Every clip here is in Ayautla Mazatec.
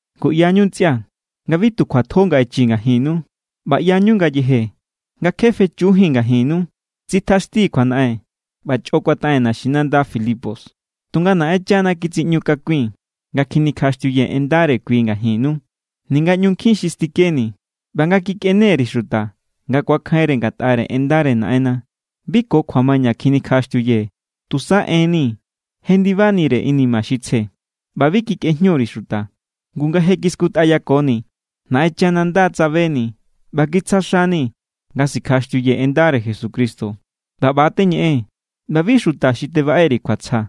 Ngu ꞌyañu, ntsꞌia̱, nga bi tu kjuatjo nga echii̱ ngajinnu. ꞌBa ꞌyañu ngayeje nga kje fechujíi̱n ngajinnu, tsitjaxtii̱ kjuanaꞌen ꞌba chꞌo kuataꞌen naxinanda Filipos, tunga Naꞌenchana kitsiꞌñu kakui̱n nga kjinikjaꞌaxtiuyee̱ en ndare kui ngajinnu, ninga ꞌñu nkjin xi stikeni̱. ꞌBa nga kikꞌene_ri̱ xuta nga ku̱akjainre ngatꞌare ꞌendare Naꞌenna, bi ko kjuamaña kjinikjaꞌaxtiuyee̱. Tusa enni̱ jendibanire inima xi tsje, ꞌba bi kikꞌejñu_ri̱ xuta. Ngu nga je kiskutꞌayakoni̱, Naꞌenchana nda tsabeni̱ ꞌba kitsja xani̱ nga sikjaꞌaxtiuyee̱ en ndare Jesucristo. ꞌBa ꞌba= teñeꞌee̱n. ꞌBa bi xuta xi tebaꞌe_ri̱ kjuatsja,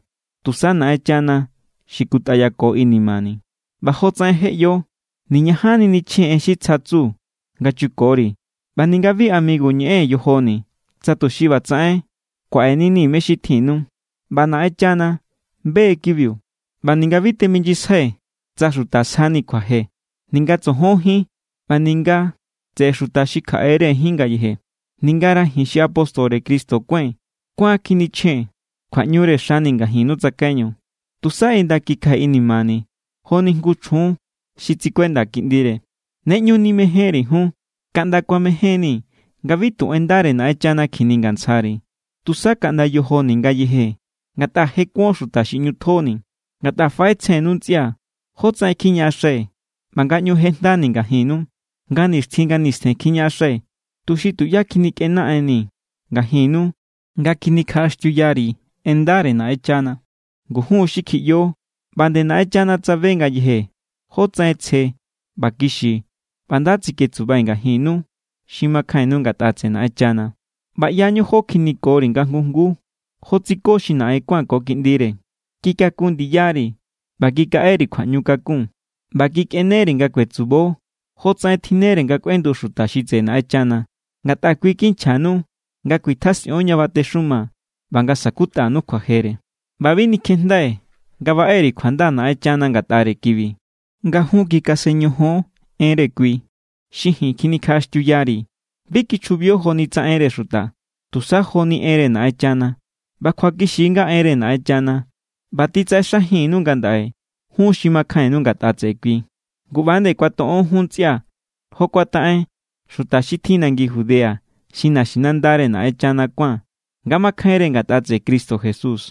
tusa Naꞌenchana xi kutꞌayako inimani̱. ꞌBa jotsaꞌen je ꞌyo, niñajanni nichjee̱n en xi tsja tsu nga chukori̱ ꞌba ninga bi amigu ñeꞌee̱n yojoni̱ tsa tuxi ꞌbatsaꞌen kuaꞌeninii̱ me xi tjinnu. ꞌBa Naꞌenchana be= kibiu. ꞌBa ninga bi teminyisjai̱ tsa xuta sjani̱ kjuaje, ninga tsojon jín ꞌba ninga tseꞌe xuta xi kjaꞌe=re jín ngayeje. Ningara ji̱n xi apóstore Cristo kuái̱n kuán= kjinichjee̱n kjuaꞌñure xani̱ ngajinnu tsakaiñu, tusa inda= kikjai̱ inimani̱ joni jngu chjun xi tsikuenda kiꞌndire. Ne ꞌñu nimejénri̱ jun. Kaꞌnda kuamejen=ni̱ nga bi tu en ndare Naꞌenchana kjiningantsjari̱, tusa kaꞌnda yojoni̱ ngayeje, ngatꞌa je kuon xuta xi ꞌñu tjoni̱. Ngatꞌa faꞌetsjennu, ntsꞌia̱, jótsaꞌen kjiñaꞌaxai̱ ꞌba nga ꞌñu jejndani̱ ngajinnu. Nga nixtjin nga nistjen kjiñaꞌaxai̱ tuxi tuꞌyá kjinikꞌenaꞌenni ngajinnu nga kjinikjaꞌaxtiuyari̱ en ndare Naꞌenchana. Ngu jun= xi kjiꞌyo ꞌba nde Naꞌenchana tsabe ngayeje jótsaꞌen tsje ꞌba kixi ꞌba nda tsiketsubai̱ ngajinnu xi makjainnu ngatꞌa tseꞌe Naꞌenchana. ꞌBa ꞌyañu jo kjinikori̱ nga jngu jnguu, jo tsiko xi naꞌen kuán ko kiꞌndire. Kikaku ndiyari̱ ꞌba kikaꞌeri̱ kjuaꞌñukakun. ꞌBa kikꞌeneri̱ nga kuetsubo jotsaꞌen tjinnere nga kꞌuendu xuta xi tseꞌe Naꞌenchana. Ngatꞌa kui= kinchjanu nga kuitjasꞌion ña batexuma ꞌba nga sa̱kutꞌanu kjuajere. ꞌBa bi nikjejndai̱ nga baꞌe_ri̱ kjuanda Naꞌenchana ngatꞌare kibi. Nga jun kikasen ñojon enre kui xi ji̱n kjinikjaꞌaxtiuyari̱, bi kichjubio joni tsa enre xuta, tusa joni enre Naꞌenchana. ꞌBa kjuakixi= nga enre Naꞌenchana, ꞌba titsaꞌexajinnu ngandaꞌe jun xi makjainnu ngatꞌa tseꞌe kui. Ngu ꞌba=nde kuatoꞌon jun, ntsꞌia̱, jo kuataꞌen xuta xi tjin nangi Judea xi naxinandare Naꞌenchana kuán nga makjainre ngatꞌa tseꞌe Cristo Jesús.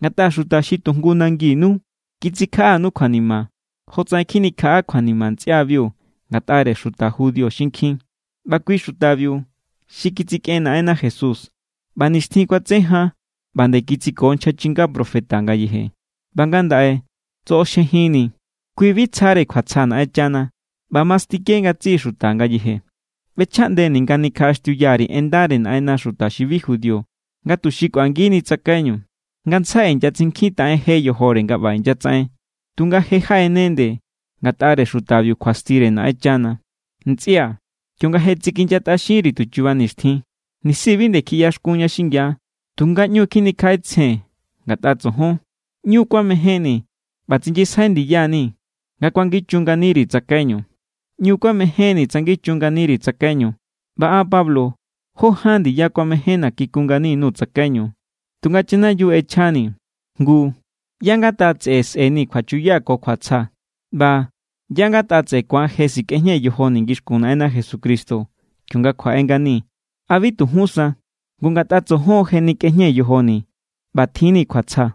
Ngatꞌa xuta xi tu jngu nanginu kitsikjaꞌanu kjuanima, jotsaꞌen kjinikjaꞌa kjuanima ntsꞌiabiu ngatꞌare xuta judío xinkjin. ꞌBa kui= xutabiu xi kitsikꞌen Naꞌenna Jesús ꞌba nixtjin kuatse jan ꞌba nde kitsiko nchja chinga profeta ngayeje, ꞌba ngandaꞌe tsoꞌoxjejinni̱. Kui bi tsjare kjuatsja Naꞌenchana ꞌba mastike ngatsiꞌi xuta ngayeje. ꞌBechjaꞌndeni̱ nga nikjaꞌaxtiuya_ri̱ en ndare Naꞌenna xuta xi bi judío nga tuxi kꞌuangini tsakaiñu. Ngantsjai inyatsinkjintaꞌen je yojore nga ꞌba inyatsaꞌen, tunga je jaꞌene nde ngatꞌare xutabiu kjuastire Naꞌenchana. Ntsꞌia̱, kionga je tsikinyatꞌaxinchiri̱ tu chuba nixtjin (nisi bi nde kjiꞌyaxkunña xingia, tunga ꞌñu= kjinikjaꞌetsjee̱n ngatꞌa tsojon), ꞌñu kuamejénni̱ ꞌba tsinyisjai ndiya=nii̱ nga kuangichu nganiri̱ tsakaiñu. ꞌÑu kuamejénni̱ tsangichun nganiri̱ tsakaiñu, ꞌba an Pablo jó ján ndiya kuamejénna̱ kikun ngani_nuu̱ tsakaiñu, tunga chanayiu ꞌechjani̱. Ngu, ¿ꞌyá= ngatꞌa tseꞌe sꞌe̱ni̱ kjuachuya ko kjuatsja? ꞌBa ¿ꞌyá ngatꞌa tseꞌe ku̱an je sikꞌejñee̱ yojoni̱ ngixkun Naꞌenna Jesucristo kionga kjuaꞌe ngani? ¿A bi tu jún sa? Ngu ngatꞌa tsojon je nikꞌejñee̱ yojoni̱ ꞌba tjinni̱ kjuatsja.